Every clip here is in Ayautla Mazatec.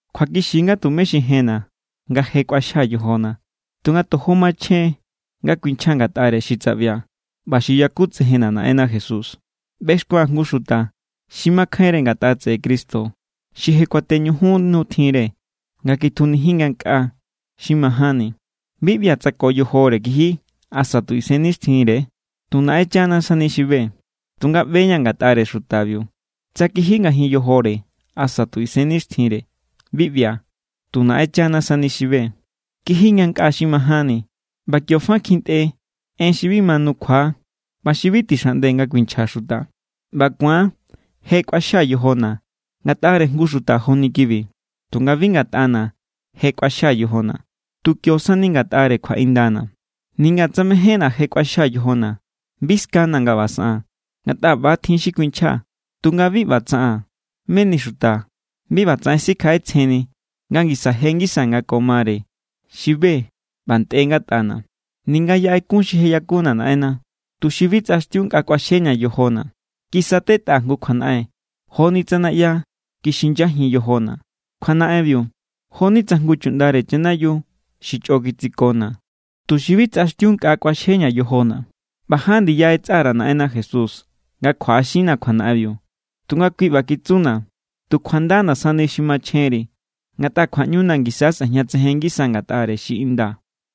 Kjuakixi= nga tumé xi jenna̱ nga je kꞌuaxjaa̱ yojona̱, tunga tojo machjen= nga kuinchjaa̱ ngatꞌare xi tsaꞌbia̱ ꞌba xi yakutsejenna̱ Naꞌenna Jesús. ꞌBexkua̱n jngu xuta xi makjainre ngatꞌa tseꞌe Cristo xi je kuateñujun nu tjinre nga kitjunijin ngankꞌaa xi majánni. Bi ꞌbia̱ tsa ko yojore kiji asa tu isennixtjinre; tu Naꞌenchana sani xi be. Tunga ꞌbe=ña̱ ngatꞌare xutabiu. Tsa kiji ngajin yojore asa tu isennixtjinre, bi ꞌbia̱. Tu Naꞌenchana sani xi be. Kiji ngankꞌaa xi majánni, ꞌba kio fa kjintꞌe en xi bi ma nukjua ꞌba xi bi tixaꞌnde nga kuinchja xuta. ꞌBa ku̱an je kꞌuaxjaa̱ yojona̱ ngatꞌare jngu xuta joni kibi. Tunga bi ngatꞌana̱ je kꞌuaxjaa̱ yojona̱, tu kio sani ngatꞌare kjuaꞌindana̱. Ninga tsa mejénna̱ je kꞌuaxjaa̱ yojona̱, bi skana̱ nga ꞌba saꞌaa̱n, ngatꞌa ꞌba= tjin xi kuinchjaa̱. Tunga bi ꞌba tsaꞌaa̱n, meni xuta bi ꞌbatsaꞌen sikjaꞌetsjenni nga ngisa je ngisa nga ko mare xi be ꞌba ntꞌe ngatꞌana̱. Ninga yaꞌe kun xi je yakuna̱ Naꞌenna, tuxi bi tsꞌaxtiu nkꞌa kꞌuaxjeña̱ yojona̱, kisatetꞌaa̱ jngu kjuanaꞌen joni tsa naꞌya kixinyajin yojona̱. Kjuanaꞌenbiu jo=ni tsa jngu chuꞌndare chanayiu xi chꞌo kitsikona̱, tuxi bi tsꞌaxtiu nkꞌa kꞌuaxjeña̱ yojona̱. ꞌBa ján ndiya ꞌetsa_ra̱ Naꞌenna Jesús nga kjuaꞌaxinna̱ kjuanaꞌenbiu. Tunga kui ꞌba kitsuna̱: “Tu kjuandana̱ sani xi machjenri, ngatꞌa kjuaꞌñuna̱ ngisa sꞌejñatsejen ngisa ngatꞌare xi inda.”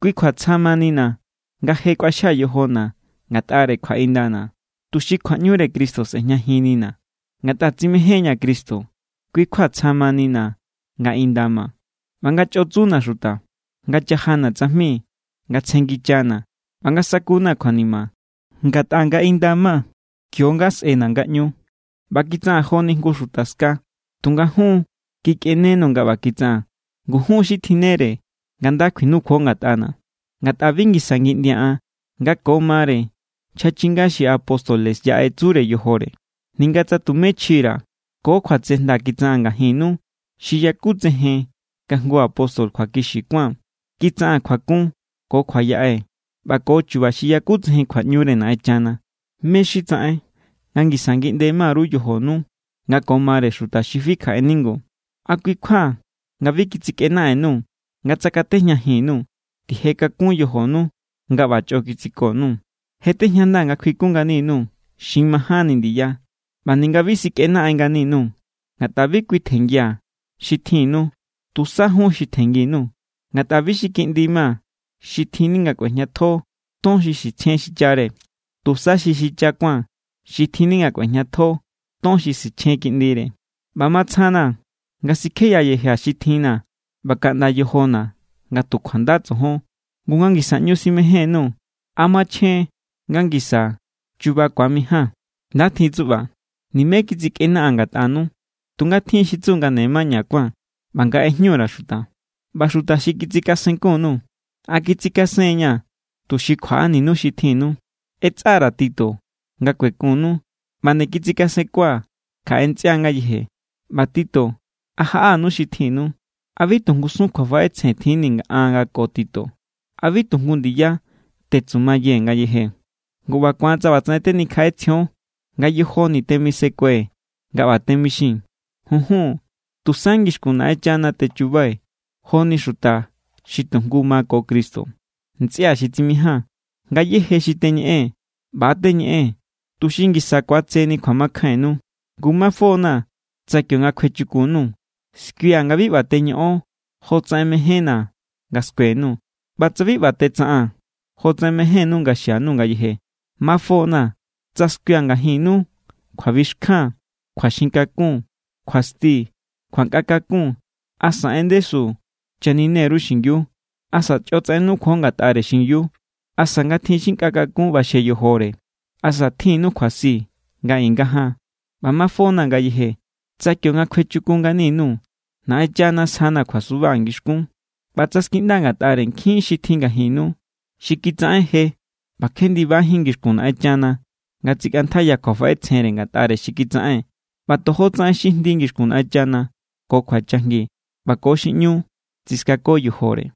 Kui kjua tsja= manina̱ nga je kꞌuaxjaa̱ yojona̱ ngatꞌare kjuaꞌindana̱, tuxi kjuaꞌñure Cristo sꞌe̱jñajinnina̱. Ngatꞌa tsimejen=ña̱ Cristo, kui= kjua tsja manina̱ nga inda ma, ꞌba nga chꞌo tsuna̱ xuta, nga chajana̱ tsajmi, nga tsjengichana̱, ꞌba nga sakuna̱ kjuanima. Ngatꞌa nga inda ma, kio=nga sꞌena̱ ngaꞌñu. ꞌBa kitsaꞌaa̱n joni jngu xuta ska, tunga jun= kikꞌenenuu̱ nga ꞌba kitsaꞌaa̱n. Ngu jun= xi tjinnere nga nda kjinukjuo ngatꞌana̱, ngatꞌa bi ngisa ngiꞌndia̱ an nga ko mare nchja chinga xi apóstoles yaꞌe tsure yojore, ninga tsa tumé chji_ra̱. Ko kjuatsejnda kitsaꞌaa̱n ngajinnu xi yakutsejen nga jngu apóstol kjuakixi kuáa̱n. Kitsaꞌaa̱n kjuakun ko kjua yaꞌe ꞌba ko chu̱ba̱ xi yakutsejen kjuaꞌñure Naꞌenchana. ¿Mé= xi tsaꞌen nga ngisa ngiꞌnde ma_ru yojonu nga ko mare xuta xi fi kjaꞌe ningu? ¿A kui= kjua nga bi kitsikꞌenaꞌen_nuu̱ nga tsakatejñajin_nuu̱? ¡Tije kakun yojonu nga ꞌba chꞌo kitsiko_nuu̱! Je tejñandaa̱ nga kjuikun ngani_nuu̱ xi majánni ndiya, ꞌba ninga bi sikꞌenaꞌen ngani_nuu̱. Ngatꞌa bi kui tjenngia̱ xi tjinnu, tusa jun xi tjenngi_nuu̱. Ngatꞌa bi xi kiꞌndi ma xi tjinni nga kꞌuejñatjo ton xi sichjen xichare, tusa xi xicha kuáa̱n xi tjinni nga kꞌuejñatjo ton xi sichjen kiꞌndire. ꞌBa matsjana̱ nga sikjeyayejia̱ xi tjinna̱ ꞌba kaꞌnda yojona̱ nga tu kjuanda tsojon. Ngu nga ngisa ꞌñu simején_nuu̱, ¿a machjen= nga ngisa chu̱ba̱ ku̱amijaa̱n? Nda tjin tsuꞌba. Nimé kitsikꞌenaꞌaa̱n ngatꞌanu. Tunga tjin xi tsu nga ne maña kuáa̱n, ꞌba nga ꞌejñu_ra̱ xuta. ꞌBa xuta xi kitsikasenkun_nuu̱, ¿a kitsikasen=ña̱ tuxi kjuaꞌaninu xi tjinnu? ꞌEtsꞌa_ra̱ Tito nga kuekunnu ꞌba nde kitsikasenkua̱ kjaꞌe ntsꞌia ngayeje. ꞌBa Tito, ¿a jaꞌanu xi tjinnu? ¿A bi tu ngusun kjuafaꞌetsjen tjinni̱ an ko Tito? ¿A bi tu jngu ndiya tetsumayee̱ ngayeje? Ngu ꞌba ku̱an tsa ꞌbatsaꞌen tenikjaꞌetsjion, nga yojoni̱ temisekue̱ nga ꞌba temixii̱n. Junjun, tusa ngixkun Naꞌenchana techubai̱ joni xuta xi tu jngu= ma ko Cristo. Ntsꞌia̱ xi tsimijaa̱n, ngayéje xi teñeꞌee̱n, ꞌba= teñeꞌee̱n tuxi ngisa ku̱atseni kjuamakjainnu. Ngu mafona̱ tsa kionga kjuechukun_nuu̱, skuia̱ nga bi ꞌba teñoꞌon jotsaꞌen mejénna̱ nga skue_nuu̱, ꞌba tsa bi ꞌba tetsaꞌaa̱n jotsaꞌen mejénnu nga xianuu̱ ngayeje. Mafona̱ tsa skuia̱ ngajinnu kjuabixkjan, kjuaxin kakun, kjuasti, kjuankꞌa kakun, asa en ndesu channine_ru xingiu, asa chꞌo tsaꞌen nukjuo ngatꞌare xingiu, asa nga tjin xi nkꞌa kakun ꞌbaxje yojore, asa tjinnu kjuasi nga i nga jan. ꞌBa mafona̱ ngayeje tsa kionga kjuechukun ngani_nuu̱, Naꞌenchana sjana̱ kjuasuba ngixkún. ꞌBa tsa skiꞌndaa̱ ngatꞌare nkjin xi tjin ngajinnu xi kitsaꞌen je ꞌba kje ndibajín ngixkun Naꞌenchana nga tsikꞌantjaiya kjuafaꞌetsjenre ngatꞌare xi kitsaꞌen, ꞌba tojo tsaꞌen xi jndi ngixkun Naꞌenchana, ko kjuachajngi, ꞌba ko xi ꞌñu tsiskako yojore.